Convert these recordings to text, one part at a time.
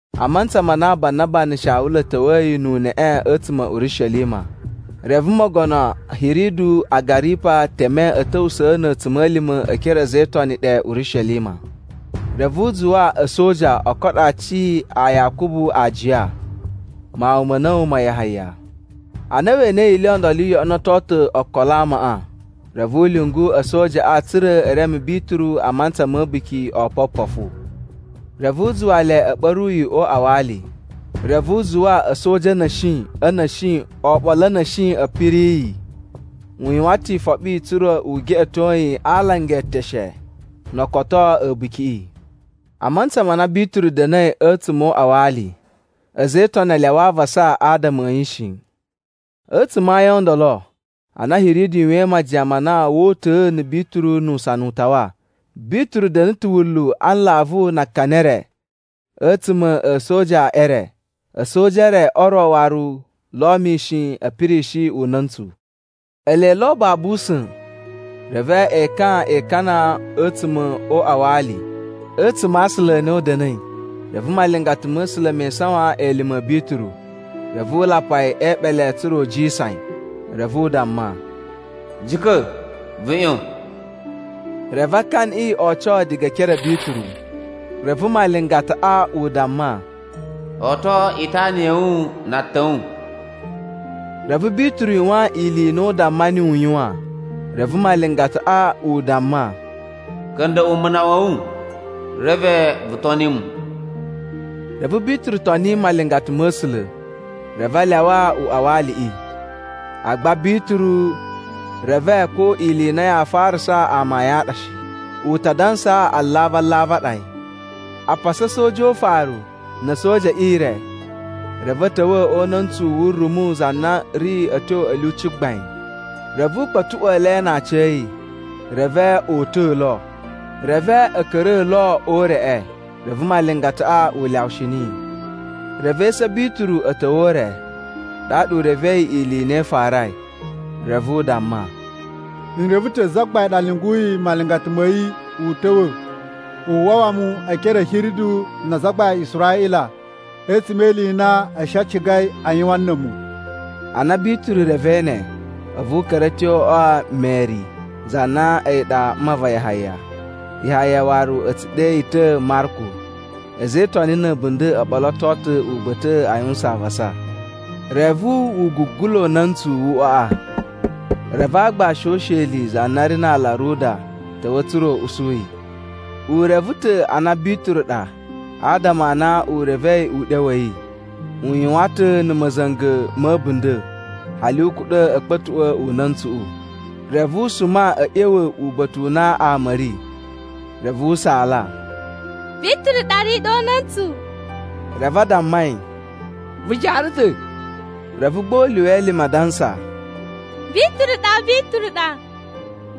A mantsa ma na Banaba na̱ Shawulu a̱ ta̱wa̱yi nu uneꞌe a̱tsuma̱ a̱ Urishelima, reve mogono Hiridu Agaripa teme a̱ ta̱wusa̱ na̱ a̱tsuma̱lima̱ e ekere a̱ a̱za̱ e Itoni ɗe Urishelima. Reve u zuwa a̱soja o koɗo aaci a Yakubu aajiya, mawun ma̱ a̱na̱wu ma Yahaya. Ana we enei ili i ndolo i yoꞌonoto ta̱ okolo a amaꞌa, reve u lyungu a̱sojaꞌa tsa̱ra̱ e reme Bituru a mantsa ma̱ A̱buki o Opopofu. Reve u zuwa le a̱ ɓa̱ru yi o uꞌwa wa ali, reve u zuwa a̱soja a̱ na̱shi a̱ na̱shi oɓolo a̱ na̱shi a̱ piri yi. U yuwan ta̱ ifoɓi tsa̱ra̱ u geꞌeto yi a alanga e eteshe no o koto a̱bukiꞌi. A mantsa ma na Bituru da̱na̱i a̱tsuma̱ o uꞌwa wa ali, a̱za̱ e Itoni a lyawa avasa adama a̱ yi shi. A̱tsuma̱ a ayin o ndolo ana Hiridu yuwain majiyan ma na woo uta̱a̱ na̱ Bituru nu usana u tawa, Bituru da̱na̱ ta̱ wunlu a nlavu na akani e re a̱tsuma̱ a̱ a̱soja e re. A̱soja e re o ro waru lo mishin a̱ pirishi una̱ntsu. Ele lo babu usa̱n, reve ekan e ikana a̱tsuma̱ o uꞌwa wa ali a̱tsuma̱ a aasula a na u da̱na̱i, reve malingata ma̱ A̱sula̱ me isawan elime a̱ Bituru. Reve u lapa yi e eeɓele tsa̱ra̱ u jisan yi. Reve u damma, “Jika̱! Vu ꞌyon!” Reve akaniꞌi o oco diga e ekere a̱ Bituru. Reve malingataꞌa u damma, “Oto itana ya̱ wu na atan a̱ wu.” Reve Bituru yuwan ili i na u damma niyi u yuwan. Reve malingataꞌa u damma, “Ka̱nda̱ꞌwa̱ umuna wa̱ wu reve vu toni mu.” Reve Bituru toni malingata ma̱ A̱sula̱, reve a lyawa uꞌwa wa aliꞌi. Agba Bituru reve ko ili i na yaa farasa amayun a ɗa shi. U ta dansa alavu alavu a ɗa yi. A pasa a̱soja o ufaru na̱ a̱soja e ire reve a̱ ta̱wa̱ o una̱ntsu wu rumu za na ri a̱ tyo a̱ lyuci gbain. Reve u kpa̱tuꞌwa̱a̱ le na aciya̱yi, reve o uta̱a̱ lo. Reve a̱ ka̱ra̱a̱ lo o ureꞌe. Reve malingataꞌa u lyawushi niyi. Reve esu a̱ Bituru a̱ ta̱wa̱ o ure, ɗaɗa u revei ili i na i farai. Reve u damma, “N reve ta̱ Zagbain ɗa lyunguyi malingata ma̱ yi u ta̱wa̱ u wawa mu e ekere a̱ Hiridu na azagbain a Israꞌila a̱tsuma̱ e ili i na a̱ shi a cigai a yuwan na̱ a̱mu.” Ana Bituru revei ne, a̱vu u ka̱ra̱ a̱ tyo o uꞌwa wa̱ Meri za na a̱yi ɗa mma va Yahaya. Yahaya waru a̱ tsu ɗe yi ta̱ Marku. A̱za̱ e Itoni na̱ a̱bunda̱ o ɓoloto ta̱ uba̱ta̱ꞌa̱ a yuwusan avasa. Reve wu gugula una̱ntsu wu uꞌwaꞌa, reve aagbashi o usheli za na ri na aala Roda ta̱wa̱ tsa̱ra̱ u usu yi. U reve ta̱ a na Bituru ɗa adama a na u revei uɗyo wa̱ yi. U yuwan ta̱ na̱ ma̱za̱nga̱ ma̱ a̱bunda̱, hali u kuɗa̱ a̱ kpa̱tuꞌwa̱ una̱ntsuꞌu. Reve u suma a̱ ꞌya̱wa̱ uba̱ta̱ u na ama a̱ ri, reve u saala, “Bituru ɗa ri ɗe o una̱ntsu!” Reve a damma yi, “Vu jaara ta̱!” Reve gba u lyuwa elime adansa, “Bituru ɗa! Bituru ɗa!”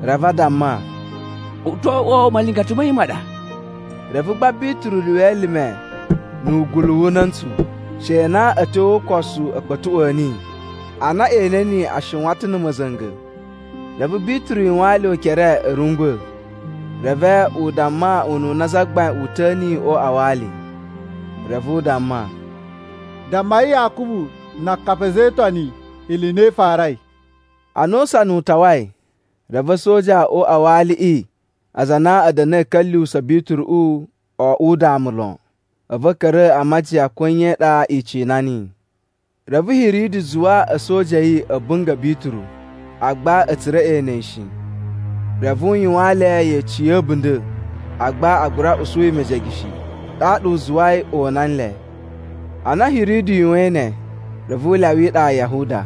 Reve a damma, “U to oꞌwo malingata ma̱ yi ma ɗa.” Reve gba Bituru lyuwa elime na̱ wugulu wu una̱ntsu, she na a̱ tyo o ukosu a̱ kpa̱tuꞌwa̱a̱ niyi. Ana e ene niyi a shiwan ta̱ na̱ ma̱za̱nga̱. Reve Bituru yuwaan le ukere a̱ rungwa̱. Reve u damma ununa Zagbain uta̱a̱ niyi o uꞌwa wa ali. Reve u damma, “Dammai Yakubu na akapi a̱ a̱za̱ e Itoni ili i na i farai.” Ana usana u tawai reve a̱soja o uꞌwa wa aliꞌi, aza a na a̱ da̱na̱i a̱ ka̱lyuwusa̱ Bituruꞌu o oꞌwo udamu lon. A̱vu a̱ ka̱ra̱ a majiyan ko nye i ɗa i cina niyi. Reve Hiridu zuwa a̱soja a̱ yi a̱ bunga̱ Bituru, agba a̱ tsura̱ e ene yi shi. Reve u yuwaan le yeci ya̱ a̱bunda̱, agba a gura usu yi mejege shi, ɗaɗa u zuwai o una nle. Ana Hiridu yuwain ne, reve u lyawa iɗa ya Yahuda,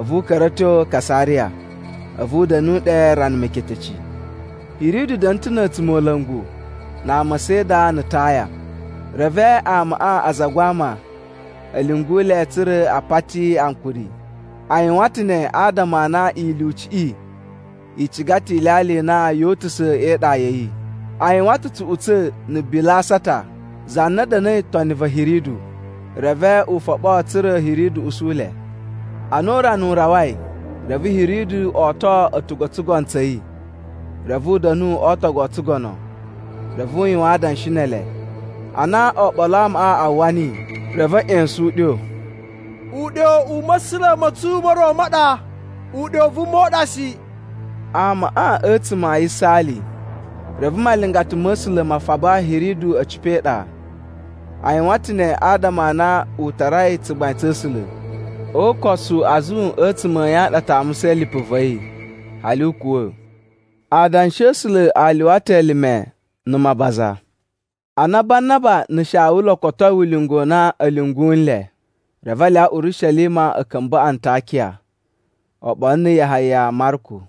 a̱vu u ka̱ra̱ a̱ tyo Kasariya. A̱vu u da̱nu ɗe rana meketeci. Hiridu da̱na̱ ta̱ na̱ a̱tsumola̱ngu na ama a Sida na̱ Taya. Reve amaꞌa a zagwa ama a̱ lyungu le tsa̱ra̱ a pati ankuri. A yuwan ta̱ ne adama a na ilyuciꞌi i ciga ta̱ ilyalya i na yoo utusa̱ e iɗa ya̱ yi. A yuwan ta̱ tsuꞌutsa̱ na̱ Bilasata, za na da̱na̱i toni va̱ Hiridu. Reve u foɓo tsa̱ra̱ Hiridu usu le. Ana urana u rawai, reve Hiridu oto a̱tugu o tsugono tsa̱ yi, reve u da̱nu o ootogu o tsugono, reve u yuwan adanshi ne ele. Ana oɓolo a amaꞌa a uwwa niyi, reve a̱ ꞌya̱sa̱n uɗyo, “Uɗyo u ma̱sula̱ ma̱ tsu mo ro ma ɗa, uɗyo u vuma u ɗa shi!” Amaꞌa a̱tsuma̱ a yisaali, reve malingata ma̱ A̱sula̱ ma faba Hiridu a̱ cipa̱ e iɗa. A yuwan ta̱ ne adama a na u tarai tsugbain tsa̱ A̱sula̱. O ukosu azun a̱tsuma̱ a̱ yi a ɗa a tamusai lipu va̱ yi, hali u kuwa̱. Adanshi a̱ A̱sula̱ a lyuwa ta̱ elime na̱ mabaza. Ana Banaba na̱ Shawulu o kotoi ulinga u na a̱ lyungu nle, reve a lyawa Urishelima a̱ ka̱mba̱ Antakiya oɓolo na̱ Yahaya Marku.